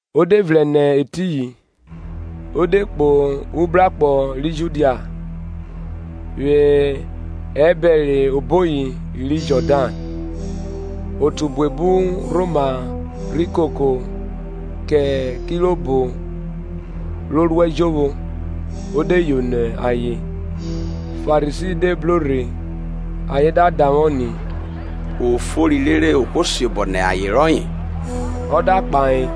Ọ de vrẹn nẹ etiyin, o de kpo ubrakpọ ri Judia vwẹ ẹbẹre oboyi ri Jọdan; o otu buebu rhoma rhi koko kẹ kirobo ro ruẹ jovwo, o de yono ayen. Farisi de bro rhe, ayen da davwọ ni, o fori rere ohwo siobọ nẹ aye rọye? Ọ da kpahọ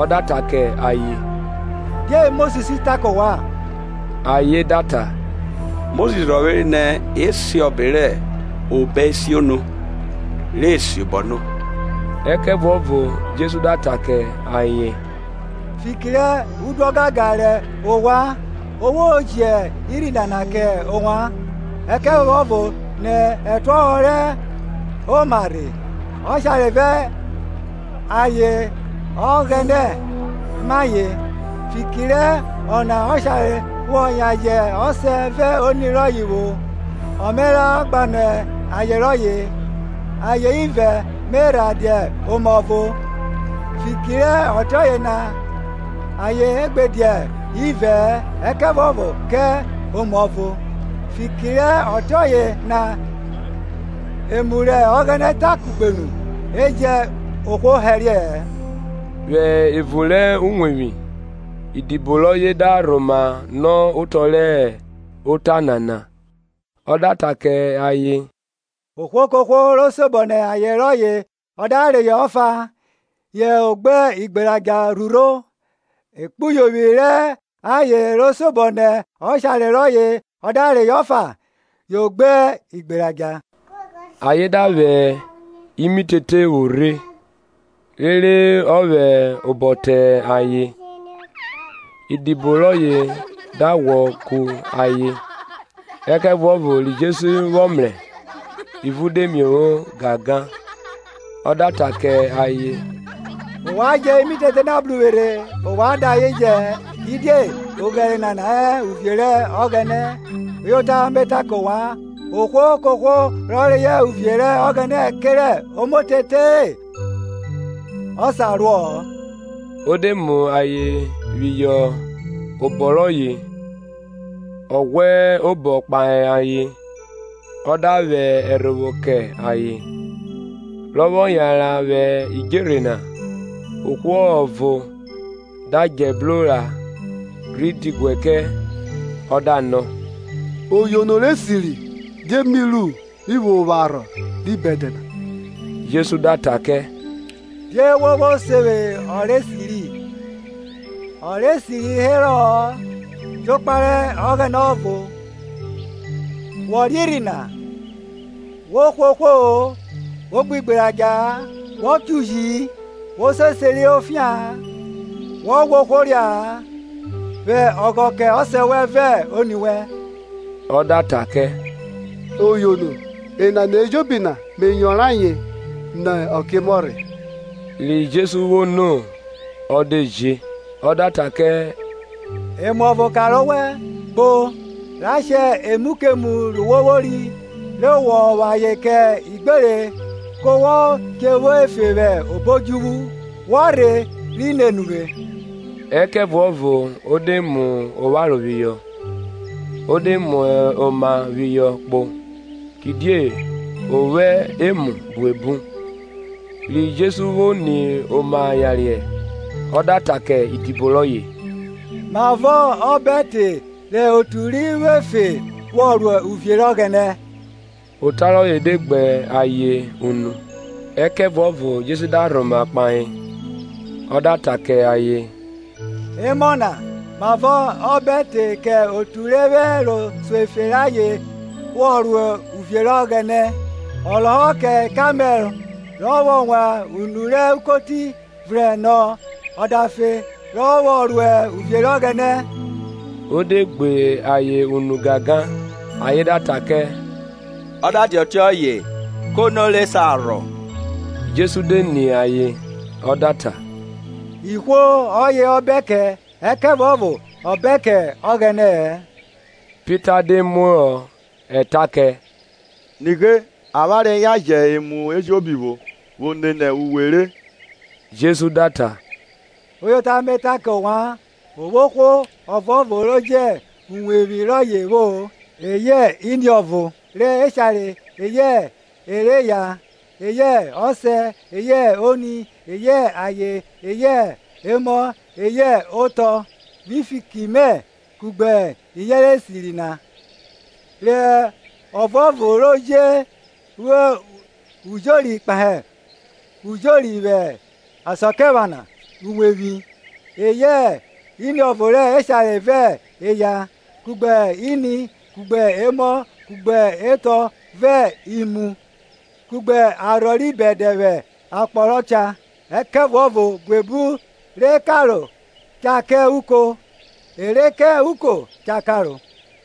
ọ da ta kẹ ayen, Die Mosis ta kẹ ovwan? Ayen da ta, Mosis rhọvwere nẹ e si ọbe rẹ obọesiono, re e siobọ no, Ẹkẹvuọvo Jesu da ta kẹ ayen, Fiki rẹ udu ọgangan rẹ ovwan o vwo ji urhi nana kẹ ovwan. Ẹkẹvuọvo nẹ ẹtuọhọ re ẹma rhe, Ọshare vẹ aye Ọghẹnẹ ma ayen. Fiki rẹ ọna ọshare vwọ yan jẹ ọsẹ vẹ oni rọye vwo, ọ Me ra gbanọ aye rọye. ayen ivẹ me rhe dia oma ọvo; fiki re ọtiọye na ayen gbe dia ivẹ-ẹ, ẹkẹvuọvo kẹ oma ọvo. Fiki rẹ ọtiọye na emu rẹ Ọghẹnẹ ta kugbe nu, e jẹn ohwo hẹriẹ-ẹ. Vwẹ evun rẹ uwevwi idibo rọye da rhoma nọ otọ rẹ ota nana. Ọ da ta kẹ ayen, ohwo kohwo ro siobọ nẹ aye rọye ọ da reyọ ọfa, yo gbe igberadja rhurho; ekpuyovwi rẹ aye ro siobọ nẹ ọshare rọye ọ da reyọ ọfa, yo gbe igberadja. Ayen da vwẹ imitete vwo rhe, rere ọ vwẹ obọ te ayen; idibo rọye da ghwọ ku ayen. Ẹkẹvuọvo ri Jesu vwọ mrẹ, ivun de miovwo gangan, Ọ da ta kẹ ayen, Ovwan jẹ imitete na bru uvwe rhe, ovwan da ayen jẹ-ẹ; kidie oghẹre nana hẹ uvie rẹ Ọghẹnẹ. Uyota mẹ ta kẹ ovwan, ohwo kohwo rọ reyọ uvie rẹ Ọghẹnẹ kerẹ omotete-e, ọ sa ruo-o. O de mu ayen phihọ obọ rọye ọ ghwẹ obọ kpahe ayen, ọ da vwẹ ẹrhovwo kẹ ayen. Rọ vwọ yanran vwẹ idjerhe na, ohwo ọvo da djẹ bro ra, rhi diguẹ kẹ, ọ da nọ, Oyono, rẹ esiri, die mi ru mi vwo vwo arhọ ri bẹdẹ na? Jesu da ta kẹ, Die wo vwo se vwe ọ rẹ esiri? ọ rẹ esiri herọ-ọ, jokpa rẹ Ọghẹnẹ ọvo. Wọ riẹn irhi na, Wo hwe ohwo-o, Wo gbe igberadja-a Wo cho uji-i, Wo se oseri rẹ ofia-an, Wo ghwa ohwo ria-a, Vwẹ ọghọ kẹ ọsẹ vẹ oni wẹn. Ọ da ta kẹ, Oyono, enana ejobi na me yọnrọn ayen nẹ ọkiemọ rhe. Ri Jesu vwo no ọ de je, ọ da ta kẹ Emu ọvo kanre owẹ; kpo, ra shẹ emu kemu ri wo vwori, re wọ vwo ayen kẹ igbere ku wo che vwo efe vwẹ obo odjuvwu; wọ rhe rhi nene uvwe. Ẹkẹvuọvo o de mu opharo phihọ o de mu oma phihọ kpo, kidie o vwo emu buebu. Ri Jesu vwo ni oma yariẹ, ọ da ta kẹ idibo rọye, mavọ ọ bẹ te re otu ri vwọ efe vwọ ro uvie rẹ Ọghẹnẹ! Ota rọye de gbe ayen unu, Ẹkẹvuọvo Jesu da rhoma kpahe, ọ da ta kẹ ayen, Emọ na, mavọ ọ bẹ te kẹ otu re vwẹ ẹro so efe rẹ ayen vwo ro uvie rẹ Ọghẹnẹ! Ọ lọhọ kẹ kamẹl rọ vwọ wan unu rẹ ukoti vrẹn, nọ, ọdafe re ọ vwọ ruẹ uvie rẹ Ọghẹnẹ. O dẹ gbẹ ayen unu gangan, ayen da ta kẹ, ọ da dia ọtiọye kẹ ono rẹ sa rhọ? Jesu de ni ayen ọ da ta, Ihwo ọyẹ ọ bẹn kẹ, ẹkẹvuọvo ọ bẹn kẹ Ọghẹnẹ-ẹ. Pita de muohọ eta kẹ, Nighe, avwanre yan jẹn emu ejobi vwo, vwo nene uwe re. Jesu da ta, Uyota mẹ ta ke ovwan, o vwo ohwo ọvuọvo re jẹn uwevwi rọye vwo, eyẹ iniọvo re eshare, eyẹ ẹ rẹ eya, eyẹ ọsẹ, eyẹ oni, eyẹ aye, eyẹ emọ, eyẹ otọ, vwi fiki mẹ, kugbe iyẹnrẹ esiri, na. rẹ ọvuọvo je vwo ujori kpahe ujori vwẹ asakiephana iwevwi, eyẹ iniọvo rẹ eshare vẹ eya, kugbe ini, kugbe emọ, kugbe etọ, vẹ imu, kugbe arhọ ri bẹdẹ vwẹ akpọ rọ cha. Ẹkẹvuọvo buebu rẹ karo cha ka uko; e rẹ ka uko cha karo.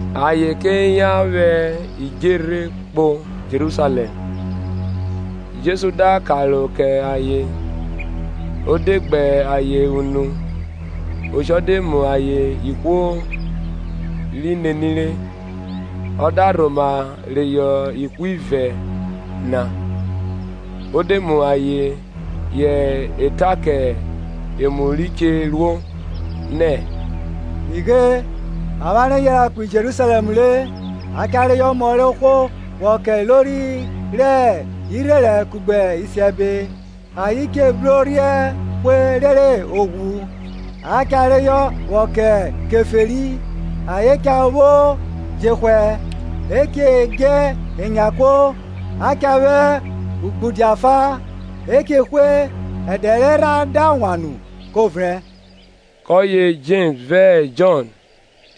Ayen ke yan vwẹ idjerhe kpo Jerusalẹm; Jesu da karo kẹ ayen; o de gbẹ ayen unu; oshọ de mu ayen ihwo ri nenire. Ọ da rhoma reyọ ihwivẹ na, o de mu ayen họ eta kẹ emu ri che ruo, nẹ, Nighe, avwanre yanran kpo Jerusalẹm re; a cha reyọ Ọmọ rẹ ohwo vwọ ke ilori rẹ irherẹn kugbe isiẹbe; ayen che bru orhiẹn hwe rere o ghwu, a cha reyọ vwọ kẹ Keferi. Ayen cha vwo jehwẹ, e che dje enyan kuo, a cha vwẹ ugbudia fa, e che hwe; ẹdẹ erha da wan nu ko vrẹn. Kọye Jems vẹ Jọn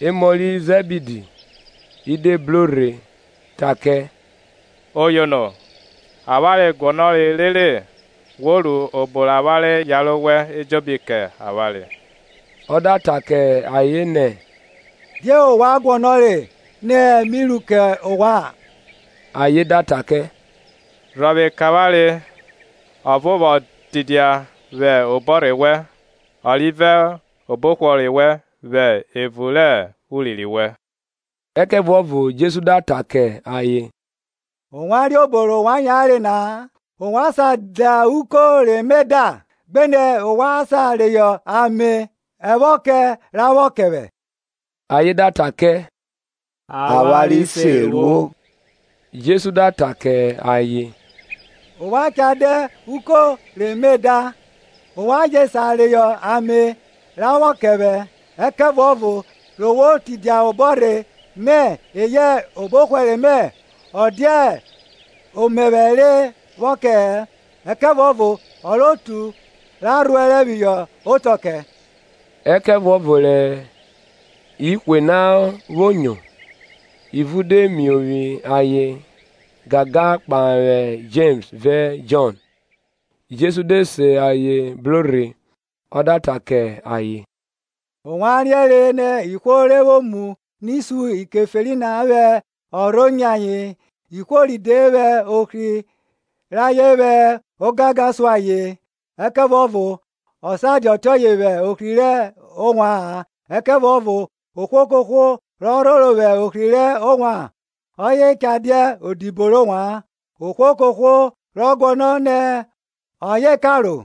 emọ ri Zẹbidi, i de bro rhe rhe ta kẹ, Oyono, avwanre guọnọre rere wo ru obo rẹ avwanre yare owẹ ejobi kẹ avwanre. Ọ da ta kẹ ayen nẹ, Die ovwan guọnọre nẹ mi ru kẹ ovwan? Ayen da ta kẹ, Rhọvwe re avwanre ọvo vwo tidia vwẹ obọrhẹ wẹn, ọ rivẹ obọhwẹre wẹn vwẹ evun rẹ urinrin wẹn. Ẹkẹvuọvo Jesu da ta kẹ ayen, Ovwan riẹn obo rẹ ovwan yare na-a. Ovwan sa da uko rẹ mẹ da? gbenẹ ovwan sa reyọ amẹ-ẹvwọkẹ ra vwọ kẹ vwẹ? Ayen da ta kẹ, avwanre se ruo. Jesu da ta kẹ ayen, ovwan cha da uko re me da; ovwan je sa reyọ amẹ-ẹvwọkẹ ra vwọ kẹ vwẹ; ẹkẹvuọvo re vwo tidia obọrhe mẹ eyẹ obọhwẹre mẹ ọ dia omẹvwẹ rẹ vwọ kẹ-ẹ; ẹkẹvuọvo ọ rẹ otu ra rhuẹrẹ phihọ otọ kẹ. Ẹkẹvuọvo rẹ ihwe na vwo nyo, ivun dẹ miovwi ayen gangan kpahe Jems vẹ Jọn. Jesu de se ayen bro rhe ọ da ta kẹ ayen, Ovwan riẹnre nẹ ihwo re vwo mu ni sun Ikeferi na vwẹ ọrho nyẹ ayen, ihwo ride vwẹ ohri rayen vwẹ ogangan sun ayen. Ẹkẹvuọvo ọ sa dia ọtiọye vwẹ ohri rẹ ovwa-an; ẹkẹvuọvo ohwo kohwo rọ rhoro vwẹ ohri rẹ ovwan, Ọye cha dia odibo rẹ ovwan; ohwo kohwo rọ guọnọ nẹ ọye karo,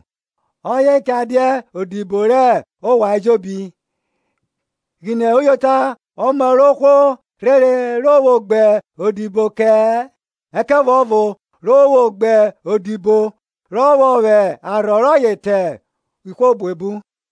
ọye cha dia odibo rẹ ovwan ejobi. Ghine uyota ọmọ rẹ ohwo rhere re vwo gbe odibo kẹ-ẹ, ẹkẹvuọvo re o vwo gbe odibo, rọ vwọ vwẹ arhọ rọye tan ihwo buebu.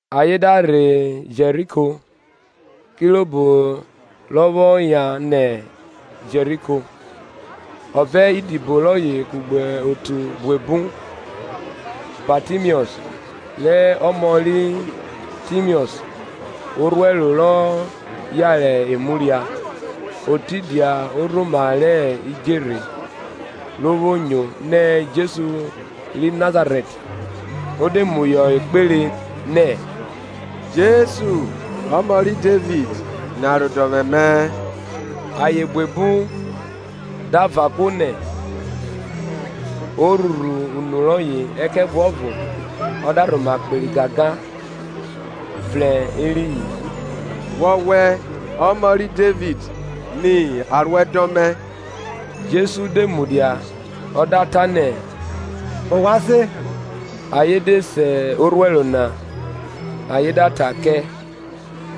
Ayen da rhe Jeriko; kirobo rọ vwọ yan nẹ Jeriko, ọ vẹ idibo rọye kugbe otu buebu, Batimiọs rẹ ọmọ ri Timiọs, orhuẹro rọ yare emu ria, o tidia orhoma rẹ idjerhe. Ro vwo nyo, nẹ Jesu ri Nazarẹt, o de muhọ ekpere, nẹ, Jesu, Ọmọ ri Devid, ni aruẹdọn mẹ. Ayen buebu da van kuo nẹ, o rhurhu unu rọye ẹkẹvuọvo ọ da rhoma kperi gangan, vrẹn eriyin, Wọwẹ Ọmọ ri Devid, ni aruẹdọn mẹ. Jesu de mudia, ọ da ta nẹ, ovwan se. Ayen de se orhuẹro na, ayen da ta kẹ,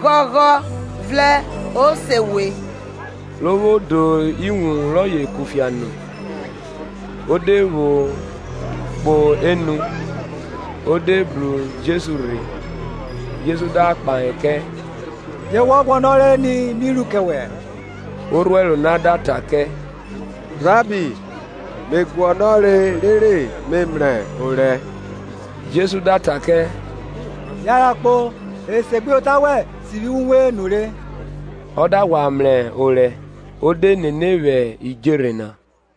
Ghọghọ, vrẹn, o se we. Ro vwo do iwun rọye kufia nu, o de pho kpo enu, o de bru Jesu rhe. Jesu da kpahe kẹ, Die wọ guọnọre ni mi ru kẹ wẹ? Orhuẹro na da ta kẹ, Rabbi, me guọnọre rere me mrẹ orẹ. Jesu da ta kẹ, yanran kpo, esegbuyota wẹn sivwi uwe nure. Ọ da ghwa mrẹ orẹ, o de nene vwẹ idjerhe na.